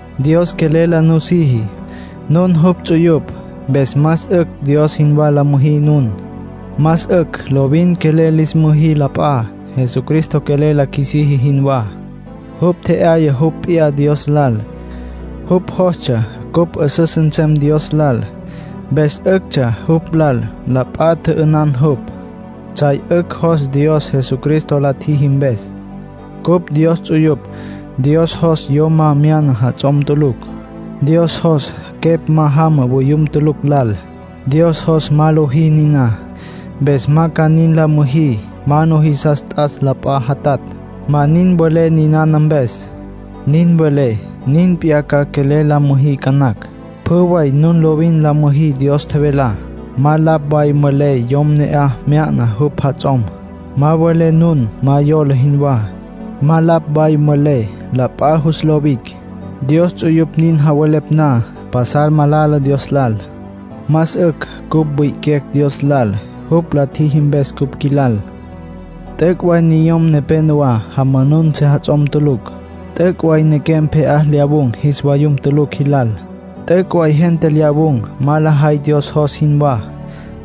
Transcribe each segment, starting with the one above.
Dios quelel la nusiji. Nun jupj ts'uyupj. Mpes más 'ücj Dios jinwá la müjí nun. Más 'ücj lovin quelel lis müjí la p'a, Jesucristo quelel la qjuisiji jinwá. Jupj tje'yaya jupj p'iyá Dios lal. Jupj jostsja cupj 'üsüs nsem Dios lal, mpes 'üctsja jupj lal la p'a tjü'ünan jupj. Tsjay 'ücj jos Dios Jesucristo la tjiji mpes. Cupj Dios ts'uyupj. Dios jos yom ma mya'na jats'om tulucj. Dios jos quepj ma jama voyum tulucj lal. Dios jos ma lojí niná, mpes ma ca nin la müjí. Ma nujisas t'as la p'a jatatj. Ma nin mvelé ninana mpes. Nin welé, nin p'iyá ca quelel la müjí ca nacj. Pjü way nun lovin la müjí Dios tjevelá. Ma lapj way mvelé yom ne'aj mya'na jupj jats'om. Ma mvelé nun ma yola jinwá. Ma lapj way mvelé, la p'a jus lo wic'. Dios ts'uyupj nin javelepj na, pasal malala Dios lal. Más 'ücj cupj wi'iquecj Dios lal, jupj la tjiji mpes cupj qjuilal. T'üc' way niyom nepenowá jamanun sejats'om tulucj. T'üc' way nequem pje'á lyawun̈ jis vayum tulucj jilal. T'üc' way gente lyawun̈ ma lajay Dios jos jinwá.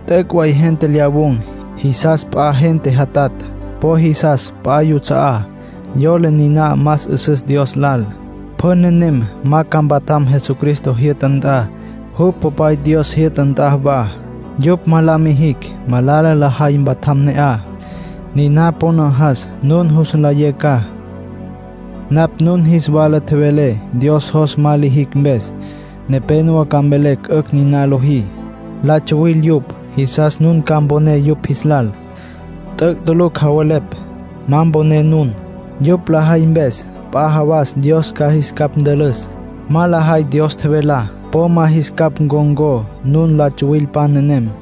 T'üc' way gente lyawun̈, jisas p'a gente jatatj. Po jisas p'a yuts'a'á; yola niná más 'üsüs Dios lal. Pjü nenem ma ca mpatjam Jesucristo jyü'ta nt'a, jupj Popay Dios jyü'ta nt'a wa. Yupj ma la mijicj malala lajay mpatjam ne'aj. Niná po najas nun jus nlayé ca. Napj nun jis wala tjevelé Dios jos ma lijicj mpes. Nepénowa ca mvelecj 'ücj nin lojí. La tsuwil yupj. Jisas nun ca mponé yupj jis lal. T'üc' tulucj javelepj. Ma mponé nun. Yupj lajay mpes, p'a jawas Dios ca jis capj ntülüs. Ma lajay Dios tjevelá. Po ma jis capj ncon̈có nun la tsuwilpan nenem.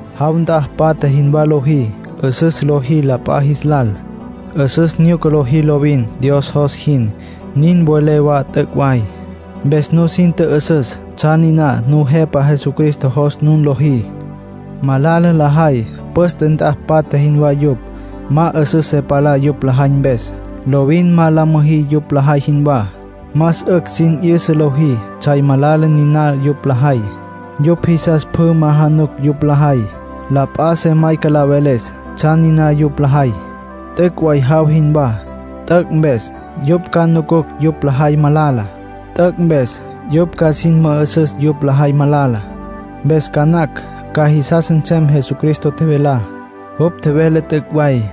Jaw nt'a patja jinwá lojí, 'üsüs lojí la p'a jis lal, 'üsüs nyuca lojí lovin Dios jos jin, nin welé wa t'üc' way. Mpes nusin tjü'üsüs tsjan niná Nujepa Jesucristo jos nun lojí. Malala lajay, püste nt'a patja jinwá yupj. Ma 'üsüs se palá yupj lajay mpes. Lovin ma la müjí yupj lajay jinwá. Más 'ücj sin 'yüsa lojí tsjay malala niná yupj lajay. Yupj jisas pjü ma januc yupj lajay. La p'a se mayca la veles tsjan niná yupj lajay. T'üc' way jaw jinwá. T'üc' mpes, yupj ca nucucj yupj lajay malala. T'üc' mpes, yupj ca sin mü'üsüs yupj lajay malala. Mpes ca nacj ca jisas nsem Jesucristo tjevelá. Jupj tjevele t'üc' way.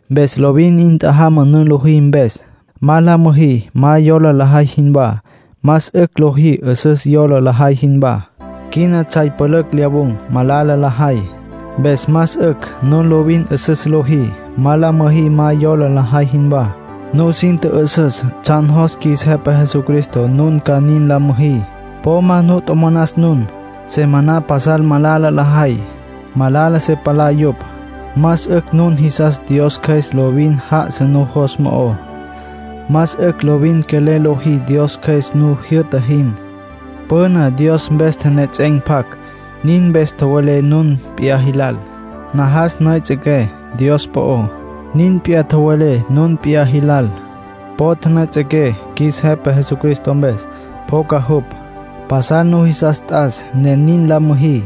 Mpes lovin 'in tjajama nun lojí mpes. Ma la müjí ma yola lajay jinwá. Más 'ücj lojí 'üsüs yola lajay jinwá. Quina tsjay pülücj lyawun̈, malala lajay. Mpes más 'ücj nun lovin 'üsüs lojí. Ma la müjí ma yola lajay jinwá. Nusin tjü'üsüs tsjan jos qjuis Jepa Jesucristo nun ca nin la müjí. Po ma nu tjomonas nun. Se maná pasal malala lajay, malala se palá yupj. Más 'ücj nun jisas Dios Cjües lovin já'asa nujos mo'ó. Más 'ücj lovin quelel lojí Dios Cjües nu jyü'ta jin. Püna Dios mpes tjenejets'en̈ tapac, niná mpes tjowelé nun p'iyá jilal. Najas nüejets'equé Dios po'ó. Nin p'iyá tjowelé nun p'iyá jilal. Po tjünüejets'equé qjuis Jepa Jesucristo mpes, pjoca jupj. Pasal nujisas t'as ne nin la müjí.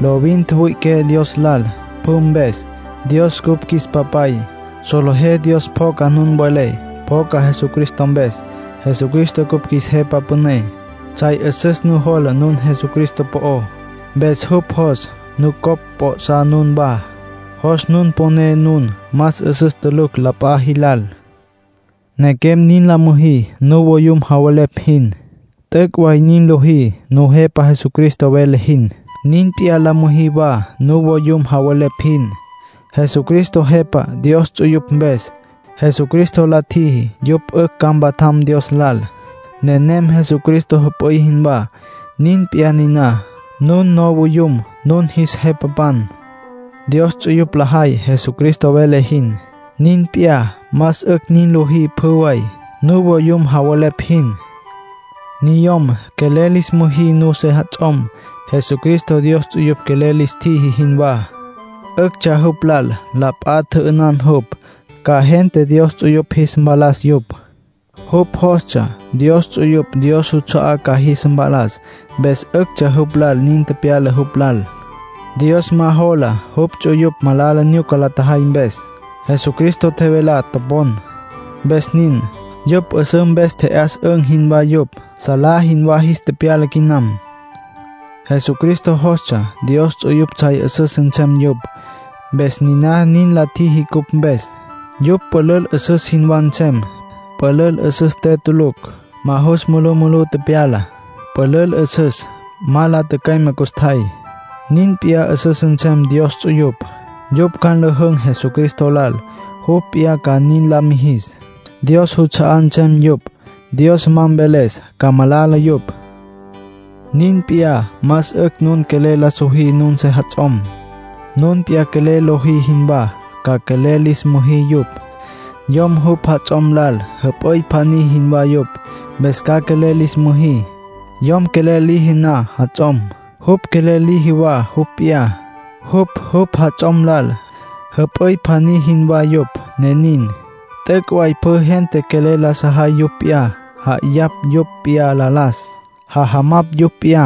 Lovin tjüwüi'iqué Dios lal pjü mpes. Dios cupj qjuis Papay. Solejé Dios pjoca nun welé. Pjoca Jesucristo mpes. Jesucristo cupj qjuis Jepa Püné. Tsjay 'üsüs nujola nun Jesucristo po'ó. Mpes jupj jos nucopj p'o'sá nunwá. Jos nun poné nun más 'üsüs tulucj la p'a jilal. Nequem, nin la müjí nuvoyum javelepj jin. T'üc' way nin lojí Nujepa Jesucristo vele jin. Nin p'iyá la müjí wa nuvoyum javelepj jin. Jesucristo Jepa Dios ts'uyupj mpes. Jesucristo la tjiji yupj 'ücj ca mpatjam Dios lal. Nenem Jesucristo jüp'üy jinwá. Nin p'iyá niná, nun nuvoyum nun jis jepapan. Dios ts'uyupj lajay Jesucristo vele jin. Nin p'iyá, más 'ücj nin lojí pjü way, nuvoyum javelepj jin. Niyom, quelel lis müjí nun sejats'om, Jesucristo Dios ts'uyupj quelel lis tjiji jinwá. 'Üctsja jupj lal la p'a tjü'ünan jupj, ca gente Dios ts'uyupj jis mpalas yupj. Jupj jostsja Dios ts'uyupj Dios juts'a'á ca jis mpalas, mpes 'üctsja jupj lal nin tepyala jupj lal. Dios ma jola jupj ts'uyupj malala nyuca la tjajay mpes. Jesucristo tjevelá topon, mpes nin. Yupj 'üsǘ mpes tje'yas'ün̈ jinwá yupj. Salá jinwá jis tepyala quinam. Jesucristo jostsja Dios ts'uyupj tsjay 'üsüs nsem yupj, mpes niná nin la tjiji cupj mpes. Yupj pülül 'üsüs jinwá nsem. Pülül 'üsüs te tulucj. Ma jus mulumulú tepyala. Pülül 'üsüs ma la tücüeme custjay. Nin p'iyá 'üsüs nsem Dios ts'uyupj. Yupj ca nlüjün̈ Jesucristo lal, jupj p'iyá ca nin la mijis. Dios juts'a'á nsem yupj. Dios ma mveles ca malala yupj. Nin p'iyá más 'ücj nun quelel la sojí nun sejats'om. Nun p'iyá quelel lojí jinwá ca quelel lis müjí yupj. Yom jupj jats'om lal jüp'üy pjaní jinwá yupj, mpes ca quelel lis müjí. Yom quelel liji na jats'om, jupj quelel liji wa jupj p'iyá. Jupj, jupj jats'om lal, jüp'üy pjaní jinwá yupj, ne nin. T'üc' way pjü gente quelel la sajay yupj p'iyá. Ja'ayapj yupj p'iyá la las. Jajamapj yupj p'iyá.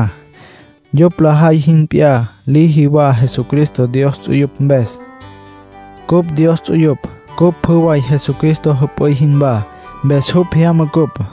Yupj lajay jin p'iyá liji wa Jesucristo Dios ts'uyupj mpes. Cupj Dios ts'uyupj. Cupj pjü way Jesucristo jüp'üy jinwá, mpes jupj jyama cupj.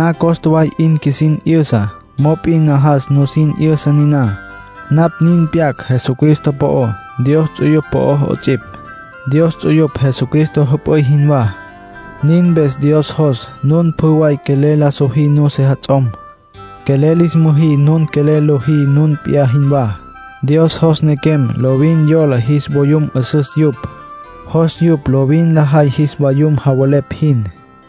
Niná costa way 'in qjuisin 'yüsa. Mop'in najas nusin 'yüsa niná. Napj nin pyac Jesucristo po'ó, Dios ts'uyupj po'ó 'ots'ipj. Dios ts'uyupj Jesucristo jüp'üy jinwá. Nin mpes Dios jos nun pjü way quelel la sojí nun sejats'om. Quelel lis müjí nun quelel lojí nun p'iyá jinwá. Dios jos nequem lovin yola jis vayum 'üsüs yupj. Jos yupj lovin lajay jis vayum javelepj jin.